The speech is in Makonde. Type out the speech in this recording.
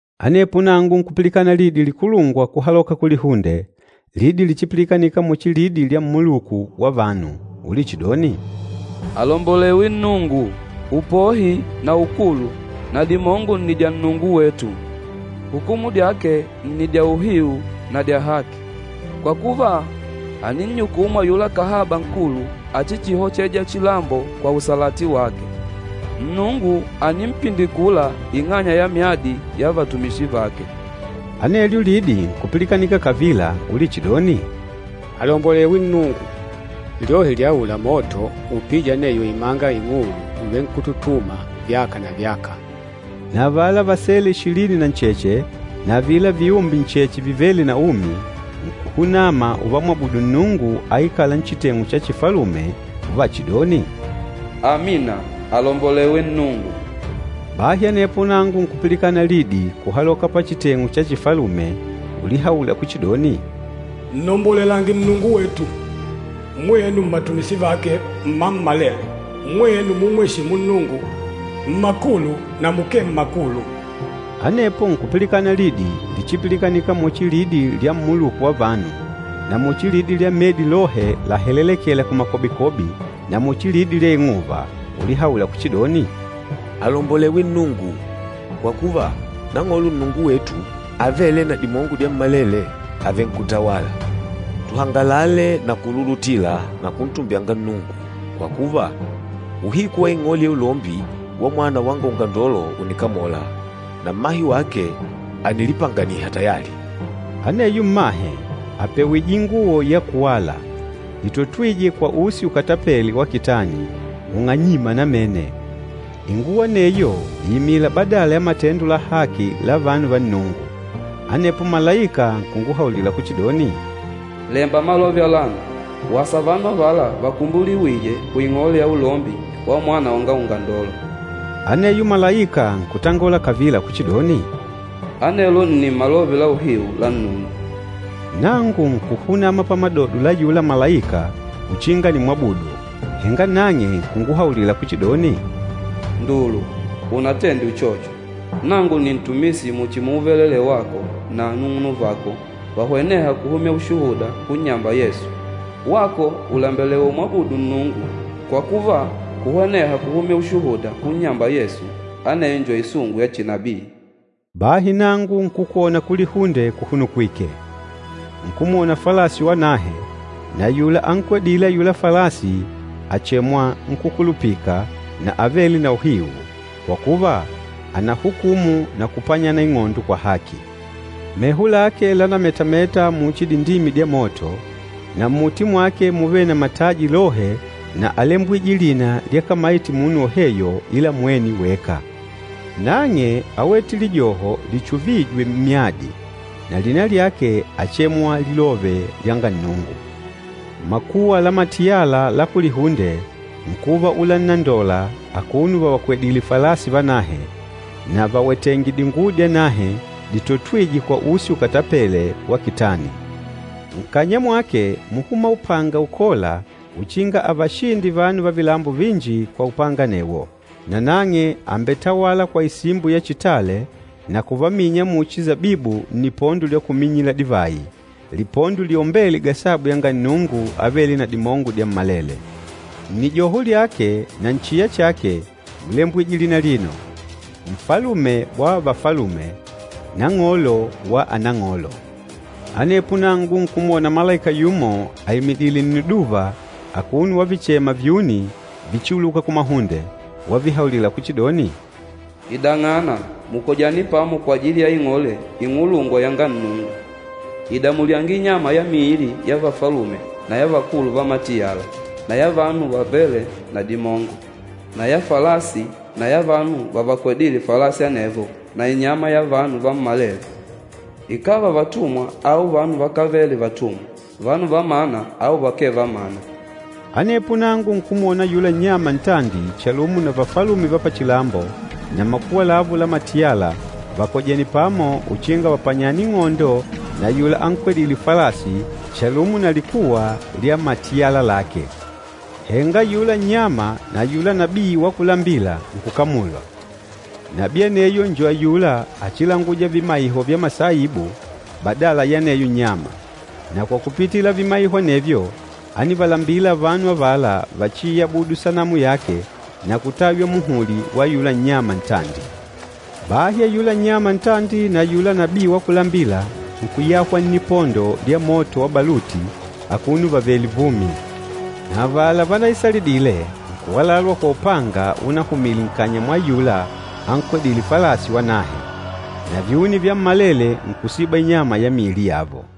Anepo nangu nkupilikana lidi likulungwa kuhaloka kulihunde, lidi lichipilikanika muchi lidi lya mmuluku wa vanu, ulichidoni, “Alombolewe Nnungu! Upohi na ukulu na dimongo nni dya Nnungu wetu. Hukumu dyake nni dya uhiu na dya haki. Kwa kuva, àninnyukumu ayula kahaba nkulu achichihocheja chilambo kwa usalati wake. Nnungu ànimpindikula ing'anya ya myadi ya vatumishi vake!” Anelyo lidi nkupilikanika kavila ulichidoni, “Alombolewe Nnungu! Lyohi lya aula moto upîja aneyo imanga ing'ulu ùvenkututuma, vyaka na vyaka!” Na avala vasele ishilini na ncheche na avila viumbe ncheche vivêle na umi, nkuhunama uvamwabudu Nnungu aikâla nchiteng'u cha chifalume uvachidoni, “Amina! Alombolewe Nnungu!” Bahi anepo nangu nkupilikanika lidi kuhaloka pachiteng'u cha chifalume ulihaula kuchidoni, “Nnombolelange Nnungu wetu, mwenu mmatumishi vake mmammalele, mwenu mumweshîmu Nnungu, mmakulu na mukee mmakulu!” Anepo nkupilikana lidi lichipilikanika muchi lidi lya mmuluku wa vanu, na muchi lidi lya medi lohe lahelelekêla kumakobikobi na muchi lidi lya ing'uva, ulihaula kuchidoni, “Alombolewe Nnungu! Kwa kuva, Nang'olo Nnungu wetu, Avêle na Dimongo Dyammalele, àvenkutawala. Tuhangalale na kululutila na kuntumbyanga Nnungu, kwa kuva, uhiku wa ing'ole ya ulombi wa Mwana wanga Ungandolo ùnikamola, na mmahe wake ànilipanganiha tayali.” Aneyo mmahe àpewije inguwo ya kuwala, itotwîje kwa usi ukatapêle wa kitani, ung'anyîma namene. Inguwo aneyo ìimila badala ya matendo la haki la vanu va Nnungu. Anepo malaika nkunguhaulila kuchidoni, “Lemba malove alano, ‘Wasa vanu avala vakumbuliwîje kuing'ole ya ulombi wa Mwana wanga Ungandolo.’” Aneyo malaika nkutangola kavila kuchidoni, “Anelo nni malove la uhiu la Nnungu.” Nangu nkuhunama pamadodo la ayula malaika uchinga nimwabudu, henga nang'e nkunguhaulila kuchidoni, “Ndulu, unatende uchocho! Nangu nni ntumishi muchi muuvelelee wako na anung'unuvako vahwenêha kuhumya ushuhuda kunnyamba Yesu. Wako ùlembelewa umwabudu Nnungu! Kwa kuva, kuhweneha kuhumya ushuhuda kunnyamba Yesu, aneyo njo isungu ya chinabii.” Bahi nangu nkukwona kulihunde kuhunukwìkè. Nkumwona falasi wanahe, na ayula ankwedîle ayula falasi àchemwa, Nkúkulupika na Avêle na Uhiu, kwa kuva, ànahukumu na kupanyana ing'ondo kwa haki. Meho lake lánametameta muchi dindimi dya moto, na mmuti mwake múvele na mataji lohe na álembwije lina lyakamayite munu woheyo ila mwene weka. Nang'e áwete lijoho lichuvîje mmyadi, na lina lyake áchemwa, Lilove lyanga Nnungu. Makuwa la matiyala la kulihunde nkuva ulannondola akuno vavakwedìlè falasi vanahe, na vawetèngè dinguwo dyanahe ditotwîje kwa usi ukatapêle wa kitani. Nkanya mwake múhuma upanga ukôla uchinga avashinde vanu va vilambo vinji kwa upanga anewo. Na nang'e àmbetawala kwa isimbo ya chitale na kuvaminya muchi sabibu nnipondo lya kuminyila divayi, lipondo liombêle gasabu yanga Nnungu Avêle na Dimongo Dyammalele. Nnijoho lyake na nchiya chake múlembwije lina alino, NFALUME WA VAFALUME, NANG'OLO WA ANANG'OLO. Anepo nangu nkumwona malaika yumo aimidìlè nniduva akuno wavichema vyuni vichiuluka kumahunde, wavihaulila kuchidoni, “Idang'ana, mukojane pamo kwajili ya ing'ole ing'ulungwa yanga Nnungu! Ida mulyange inyama ya miili ya vafalume na ya vakulu va matiyala na ya vanu vavêle na dimongo, na ya falasi na ya vanu vavakwedîle falasi anevo na inyama ya vanu vammalele, ikàva vatumwa au vanu vakávele vatumwa, vanu va mana au vakee va mana.” Anepo nangu nkumwona ayula nnyama ntandi chalumo na vafalume va pachilambo na makuwa lavo la matiyala vakojènè pamo uchinga vapanyane ing'ondo na ayula ankwedîle falasi chalumo na likuwa lya matiyala lake. Henga ayula nnyama na ayula nabii wa kulambila nkukamulwa. Nabii aneyo njo ayula achilangûja vimaiho vya masaibu badala ya aneyo nnyama, na kwa kupitila vimaiho anevyo ánivalambila vanu avala vachiiyabudu sanamu yake na kutaywa muhuli wa ayula nnyama ntandi. Bahi ayula nnyama ntandi na ayula nabii wa kulambila nkuyahwa nnipondo lya moto wa baluti akuno vavèlè vumi. Na avala vanaisalidile nkuwalalwa kwa upanga unahumile nkanya mwa ayula ankwedîle falasi wanahe. Na vyuni vyammalele nkusiba inyama ya miili yavo.